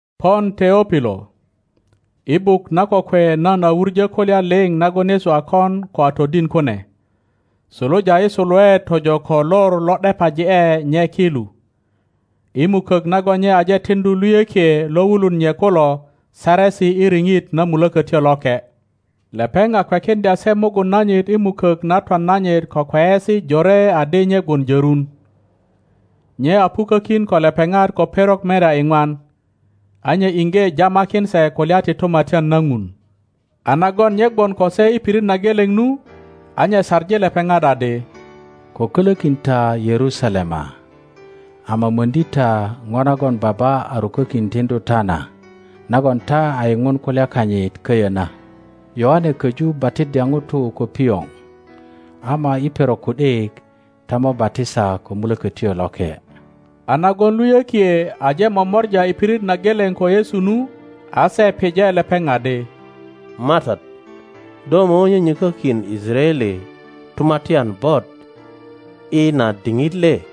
Pon Teopilo, i buk na kokwe nan a wuŋo kulya liŋ nagon Yesu a kon ko a todin kune, suluja i suluet tojo ko lor lo ’depaji ’e nye ki lu, i mukok nagon nye aje tiŋdu luyökie lo wulun nye kulo saresi i riŋit na Mulokotyo Loke. Lepeŋ a kwekiŋdya se mugun nanyit i mukok na twan nanyit ko kweyesi jore adi nye gwon jörun. Nye a pukokin ko lepepat ko perok merya iŋwan, a nye iŋge jamakin se kulya ti Tumatyan na Ŋun. A nagon nye gwon ko se i pirit na geleŋ nu, a nye saŋi lepepat adi, Ko kolokin ta Yerusalema, ama riŋdi ta ŋo nagon Baba a rukokin tiŋdu ta na, nagon ta a yiŋun kulya kanyit köyö na. Yoane koju batiddya ŋutu ko pioŋ, ama i perok ku ’dik ta mo batisa ko Mulökötyo Loke. A nagon luyökie aje momora i pirit na geleŋ ko Yesu nu, a se pije lepeŋ adi, MATAT, do mo nyonyökokin Yisaraele tumatyan bot i na diŋit le?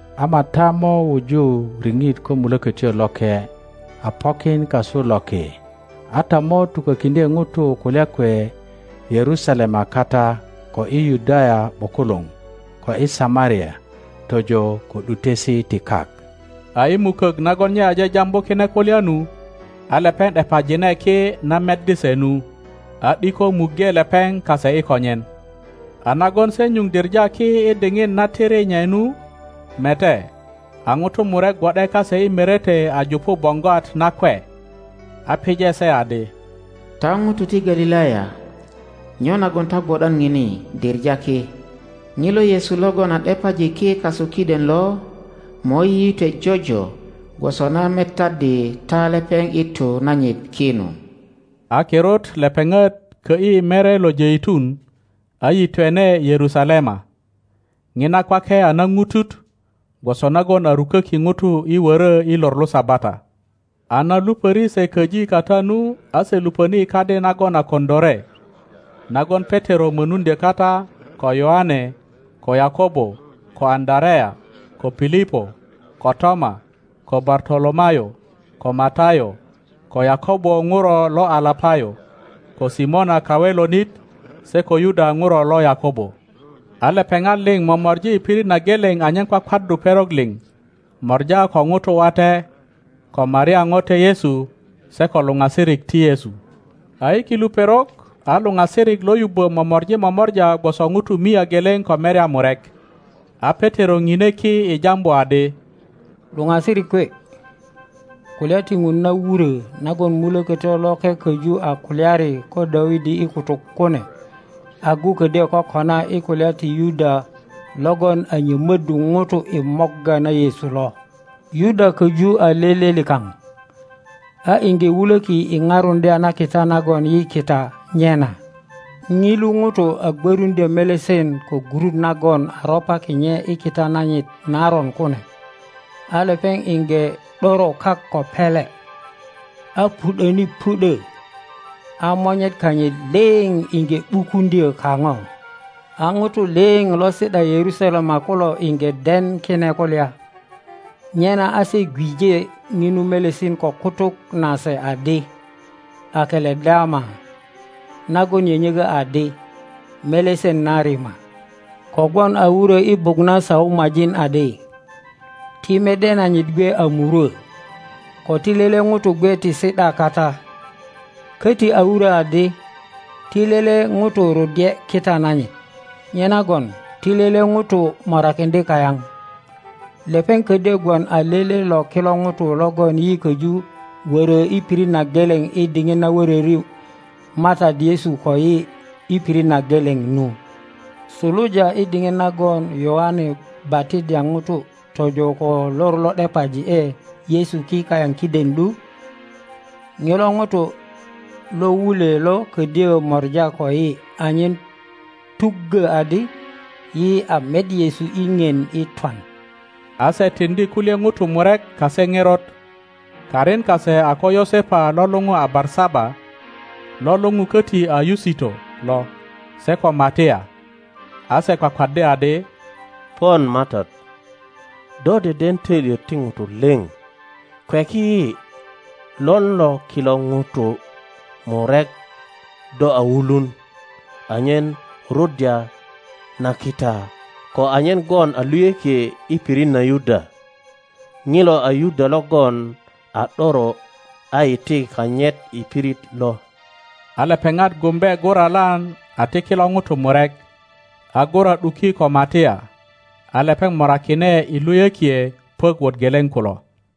Ama ta mo wuju riŋit ko Mulökötyo Loke a pokin kasu loki; a ta mo tukokiŋdye ŋutu kulya kwe Yerusalema kata, ko i Yudaya ’bukuluŋ, ko i Samaria, tojo ko ’dutesi ti kak. A i mukok nagon nye aje jambu kine kulya nu, a lepeŋ ’depajine ki na meddi se nu, a ’diko muŋge lepeŋ kase i konyen. A nagon se nyuŋ diŋa ki i diŋit na tiri nye nu, mete, a ŋutu murek gwo ’de kase i merete a jupu boŋgwat nakwe. A pije se adi, Ta ŋutu ti Galilaya, nyo nagon ta gwo ’dan ŋini diŋa ki? ŋilo Yesu logon a ’depaji ki kasu kiden lo mo yiyitwe jojo gwoso na metaddi ta lepeŋ i tu nanyit ki nu. A kirut lepeŋat kö ’yi mere lo Jeitun, a yitwene Yerusalema. Ŋina kwake a naŋutut, gwoso nagon a ruköki ŋutu i woro i lor lo Sabata. A na lupöri se köji kata nu, a se luponi i kadi nagon a koŋilore, nagon Petero moruŋdyo kata, ko Yoane, ko Yakobo, ko Aŋöarea, ko Pilipo, ko Toma, ko Bartolomayo, ko Matayo, ko Yakobo ŋuro lo Alapayo, ko Simona Kawelonit, se ko Yuda ŋuro lo Yakobo. A lepeŋat liŋ momori i pirit na geleŋ anyen kwakwaddu perok liŋ, mora ko ŋutu wate, ko Maria ŋote Yesu, se ko luŋasirik ti Yesu. A i kilu perok, a luŋasirik lo yubbo momori momora gwoso ŋutu mia geleŋ ko merya murek, a Petero ŋine ki i jambu adi, Luŋasirik kwe, Kulya ti ŋun na wuro nagon Mulokotyo Loke köju a kulyari ko Dawidi i kutuk kune, agu ködyö kokona i kulya ti Yuda logon a nyomoddu ŋutu i morga na Yesu lo. Yuda köju a lele likaŋ, a iŋge wulöki i parundya na kita nagon yi kita nye na. (Ŋilu ŋuto a gwöruŋdyö melesen ko gurut nagon a ropaki nye i kita nanyit naron kune; a lepeŋ iŋge ’doro kak ko pele, a pu ’döni pu ’dö, a monyet kanyit liŋ iŋge ’bukuŋdyo kaŋo. A ŋutu liŋ lo si ’da Yerusalema kulo iŋge den kine kulya, nyena a se gweŋ ŋinu melesen ko kutuk nase adi, Akeledama, nagon nyönyökö adi, Melesen na Rima.) Kogwon a wuro i Buk na Saumajin adi, Ti mede nanyit gwe a murwö, ko ti lele ŋuto gwe ti si ’da kata. Köti a wurö adi, Ti lele ŋuto ruddye kita nanyit. Nyenagon ti lele ŋuto morakiŋdye kayaŋ. Lepeŋ ködyö gwon a tele lo kilo ŋutu logon yi köju wörö i pirit na geleŋ i diŋit na wöröri MATAT Yesu koyi i pirit na geleŋ nu, suluja i diŋit nagon Yoane batiddya ŋutu tojo ko lor lo ’depaji ’e Yesu ki kayaŋ kiden lu. Ŋilo ŋuto lo wulwe lo ködyö mora koyi anyen tuggö adi yi a met Yesu i ŋien i twan. A se tiŋdi kulye ŋutu murek kase nerot. Karin kase a ko Yosepa lo luŋu a Barsaba, lo luŋu koti a Yusito lo, se ko Matia. a se kwakwaddi adi, Pon MATAT, do deden toilyet ti ŋutu liŋ, kweki yi lon lo kilo ŋutu murek do a wulun, anyen ruddya na kita koanyen gwon a luyökie i pirit na Yuda. Ŋilo a Yuda logon a ’doro a iti kanyit i pirit lo. A lepeŋat gumbe guralan a ti kilo ŋutu murek, a gura ’duki ko Matia; a lepeŋ morakine i luyökie puök wot geleŋ kulo.